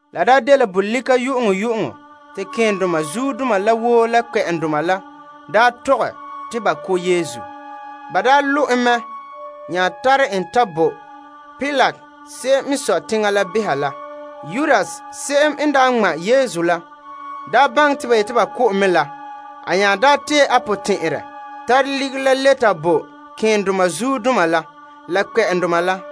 La daa dela bolika yu'uŋyu'uŋɔ te malema keendoma la woo la kpɛ'ɛndoma la tɔgɛ te ba ko' Yesu. Ba lo' en mɛ nya tare en ta bo Pilate se'em n sɔe teŋa la beha la. Yudas se'em n daa ŋma' Yesu la n daa ta baŋɛ te ba yeti ba ko' en mɛ, a nya tee a potɛn'ɛrɛ ge tare ligiri la le ta bo malema keendoma la kpɛ'ɛndoma la.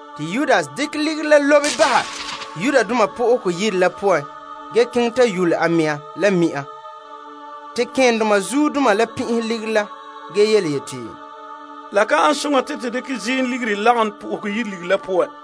Te Yudas dekɛ ligiri la lobe bahɛ Yenɛ Yire la poan ge keŋɛ ta yule a mɛŋa. Malema keendoma la pin'ihe ligiri la yeti, La ka ane soŋa te to dekɛ ziim ligiri lebehe Yenɛ Yire ligiri la poan.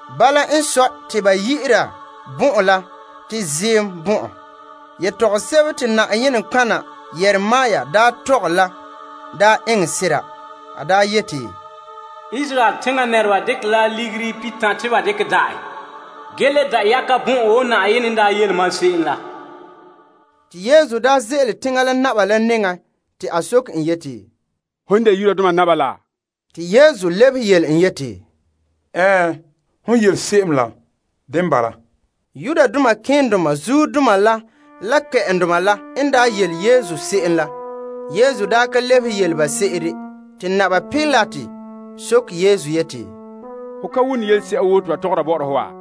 Bala n sɔe te ba yi'ira bɔn'ɔn la te Ziim Bɔn'ɔn. Yetɔgom sebo te Na'ayenɛ nɔtɔgɔha Yeremia daa tɔgɛ la daa eŋɛ sera. A daa yeti, ba magahɛ sanlenpeela pihitan' te ba dekɛ da' en. Ge le da' yagombaha bɔn'ɔn wo Na'ayenɛ n tɔgɛ se'em la. Yesu n daa ze'ele la teŋbehera la nɛŋan te teŋbehera soke en yeti, Hom n de Yudoma naba la? Yesu lebehe yeti, Ɛɛn, hon yele se'em la dene bala. Malema keendoma la kpɛ'ɛndoma la n daa zɛrɛgɛ Yesu yelese'a poan la, a daa ka lebehe yele ba se'ere. Te Pilate soke en yeti, Ho ka wone yelese'a woo te ba tɔgɔra bɔ'ɔra ho wa?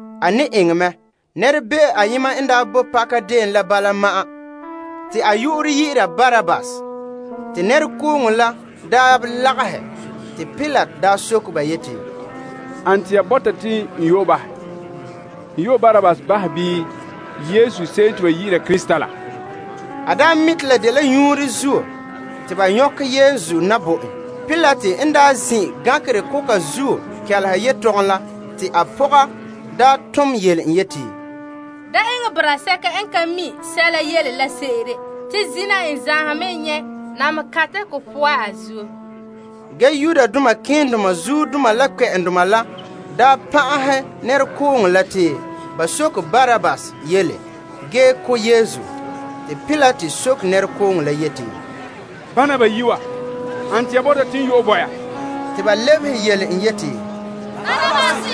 Bala ma'an nɛrebe'o ayema n daa boe pakadeen la, te a yu'urɛ dɛna Barabbas. Te nɛrekooŋɔ la n daa lagahɛ, Pilate soke ba yeti, Ane te ya bɔta te n yu'ɛ bahɛ? N yu'ɛ Barabbas bahɛ bii Yesu se'em te ba yi'ira Krista la? A mi' te la dela nyuunre zuo te ba nyɔkɛ Yesu na bo en. Pilate n zin' gankerɛ koka zuo kɛleha yetɔgom la, te a pɔga tom yele en yeti, Da eŋɛ boraa sɛka n ka tare tuure, te zina n zaanhom mɛ nyɛ' namehe kantɛ ko poan a zuo. Ge malema keendoma la la kpɛ'ɛndoma la pan'ahɛ nɛrekooŋɔ la te ba soke Barabbas yele ge ko' Yesu. Te teŋbehera soke nɛrekooŋɔ la yeti, Bana bayi' wa, ane te ya bɔta te n yu'ɛ bo ya? Te ba lebehe yeti, Barabbas.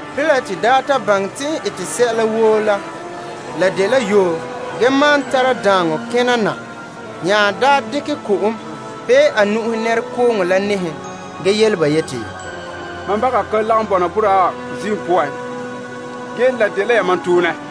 Pilate n daa ta baŋɛ te n ete sɛla woo la, ge te dela yoo gee maan tara daaŋɔ kena na, a nya dekɛ ko'om pee a nu'uhe nɛrekooŋɔ la nɛɛhe ge yele ba yeti, Mam nu'uhen ka lagom bɔna boraa wa ziim poan. Ge la dela yamam toonɛ.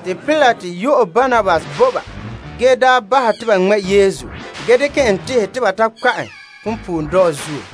Pilate nya yu'ɛ Barabbas bo ba ge bahɛ te ba ŋmɛ' Yesu ge dekɛ en tehɛ te ba ta kpa' en punpuuredɔɔ zuo.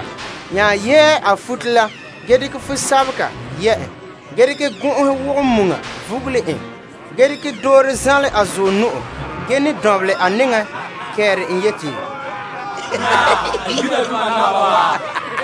Ba nya yɛɛ a futo la ge dekɛ fumɔlɔgɔ yɛ' en. Ba nya dekɛ gɔn'ɔhe wogɛ muŋa vugule en, ge dekɛ doore zanlɛ a zuɔ nu'o ge ne dɔnbelɛ a nɛŋa kɛɛta en yeti, Naa, Yudoma naba wa.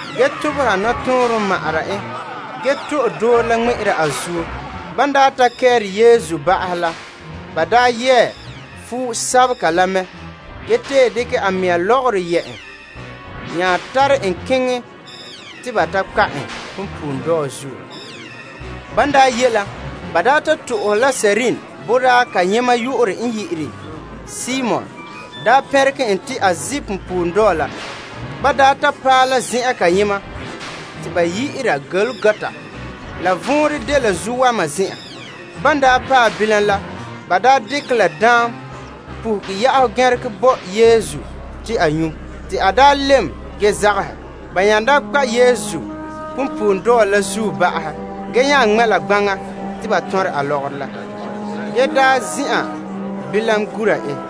Ba tobehɛ nɔtɔɔnrom ma' en ge to'e doore la ŋmɛ'ɛra a zuo. Ban daa ta kɛɛre Yesu ba'ahɛ la, ba yɛɛ fumɔlɔgɔ la mɛ ge tee dekɛ a mɛŋa lɔgɔrɔ yɛ' en. Ba nya tare en keŋɛ te ba ta kpa' en punpuuredɔɔ zuo. Ban daa ye la, ba ta to'ohɛ la Kirene boraa kayema yu'urɛ n de Simon pɛnregɛ en te a zi' punpuuredɔɔ la. Ba ta paɛ la zen'an kayema te ba yi'ira Golgota, la vɔnrɛn dela Zuowama Zen'an. Bilam te ba dekɛ la daam puhuge ya'am gɛnregɛ bo Yesu te a nyu', te a lɛm ge zagahɛ. Ban kpa' en punpuuredɔɔ la zuo, ba nya ŋmɛ' la gbaŋa te ba tɔnrɛ a lɔgɔrɔ la. Ge ba zin'an bilam gura en.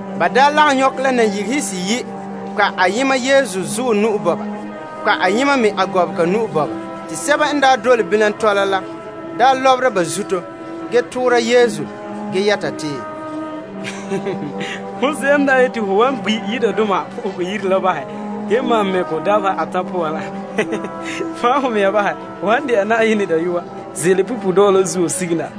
Ba lagom la nayigehe seyi' kpa' ayema Yesu zuɔ ge kpa' ayema me a gɔbega. Te sɛba n dole bilam tɔla la lɔbera ba zuto toora Yesu ge yɛta te, Hon se'em n yeti ho wan gbi' Yenɛ Yire la bahɛ ge maan mɛ' kɔ dabeha atan' poan la, fan' ho mɛŋa bahɛ! Ho han dɛna Na'ayenɛ Dayɔa, ze'ele punpuuredɔɔ la zuo sige na!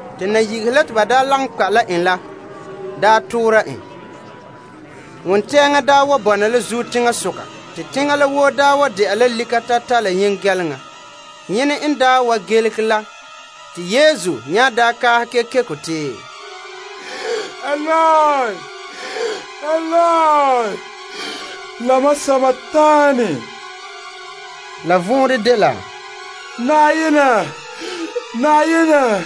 Te nayigehe la te ba lagom kpa' la en la, me toora en. Wontɛɛŋa daa wa bɔna la zuo teŋasoka te teŋa la woo wa de'a lika tatata la yengɛleŋa. Yene n wa gelege la te Yesu nya kaahɛ kekeko te, Eloi, Eloi, lama sabakanii? La vɔnrɛ dela, Mam Yenɛ, mam Yenɛ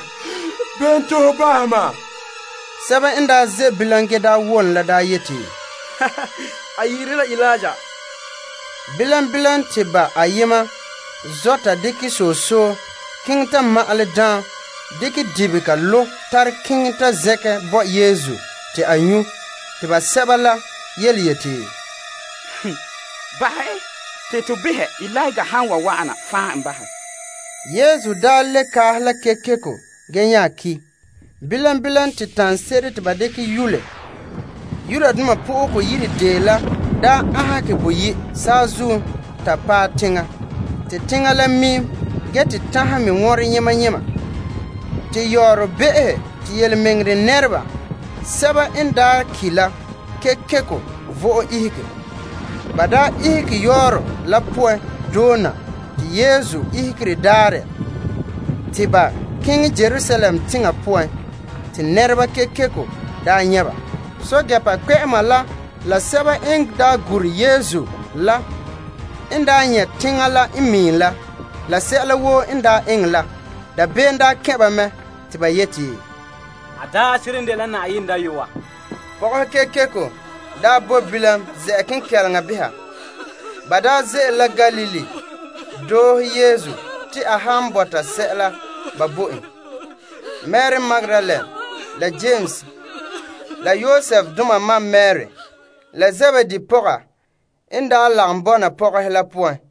bene zuo te ho zagaha mam? Sɛba n ze' bilam ge wom la daa yeti, A yi'ire la Eliya. Bilam bilam te ba ayema zɔ' ta dekɛ soso keŋɛ ta ma'alɛ daam dekɛ dibega lo' tare keŋɛ ta zɛnkɛ bo Yesu te a nyu'. Te basɛba la yeti, Bahɛ en, te to behɛ Eliya han wan wa'an fan' en bahɛ. Ge Yesu le kaahe la kekeko ge nya ki'. Bilam bilam te taŋse'ere te ba daa dekɛ yule Yenɛ Yire la aanhegɛ boyi', saazuo ta paɛ teŋa. Te teŋa la miim gee te tanhɛ me wɔnrɛ yema yema. Yɔɔrɔ be'ehe te Yenɛ nɛreba sɛba n daa ki' la kekeko vo'e ihege. Ba ihege yɔɔrɔ la poan doona te Yesu ihegere daarɛ te ba keŋɛ Yerusalem teŋa poan te nɛreba kekeko nyɛ' ba. Pɛɛntɛɛnreba kpɛ'ɛma la sɛba n daa gure Yesu n nyɛ' teŋa la n miim la sɛla woo n eŋɛ la, dabeem n kɛn' ba te ba yeti, A seren dela Na'ayenɛ Dayɔa. Pɔgɔhe kekeko bo bilam ze'a kenkɛleŋa beha. Ba daa ze'ele la Galilee doohe Yesu soŋora en. Mari Magdalene la Yames la Yosefdoma ma Mari la Zebedee pɔga lagom bɔna ba la poan.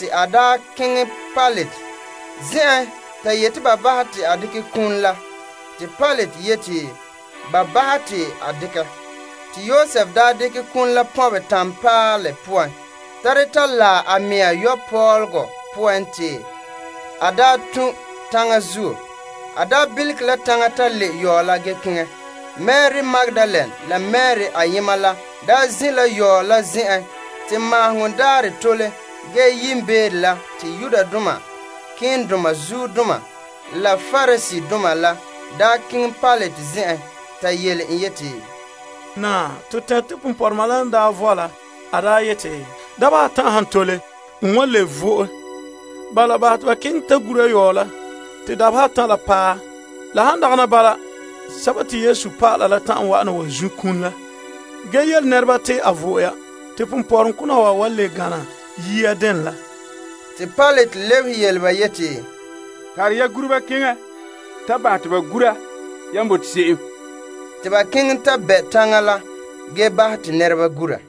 A keŋɛ Pilate zen'en ta yeti ba bahɛ te a dekɛ Yesu iŋa la, te Pilate yeti ba bahɛ te a dekɛ. Yosef daa dekɛ iŋa la pɔnbɛ tanpaalɛ poan, tare ta laɛ a mɛŋa yokopɔlɔgɔ poan te a daa tun' taŋa zuo. A daa bilige la taŋa ta le' yɔɔ la ge keŋɛ. Mari Magdalene la Mari ayema la daa zin' la yɔɔ la zen'en. Te Maaheŋɔ Daarɛ n tole ge yiimbeere, malema keendoma la Pariseedoma la keŋɛ Pilate zen'en. Ba yele en yeti, Naa, to tɛnre te ponpɔrɔma la n daa vɔe la a daa yeti, dabeha atan' han tole, n wan le vo'e. Bala, bahɛ te ba keŋɛ ta gura yɔɔ la te dabeha atan' la paɛ. Han dagana bala, a dɔlɔba la ta'an wa'ana zun' kum la ge yele nɛreba te a vo'e ya, ge te ponpɔrɔŋkona wa wan le gana yia dene la. Pilate lebehe ba yeti, Tare ya guruba keŋɛ ta bahɛ te ba gura yan bote se'em. Te ba keŋɛ ta dekɛ danlehom bɛ' taŋa la ge bahɛ te nɛreba gura.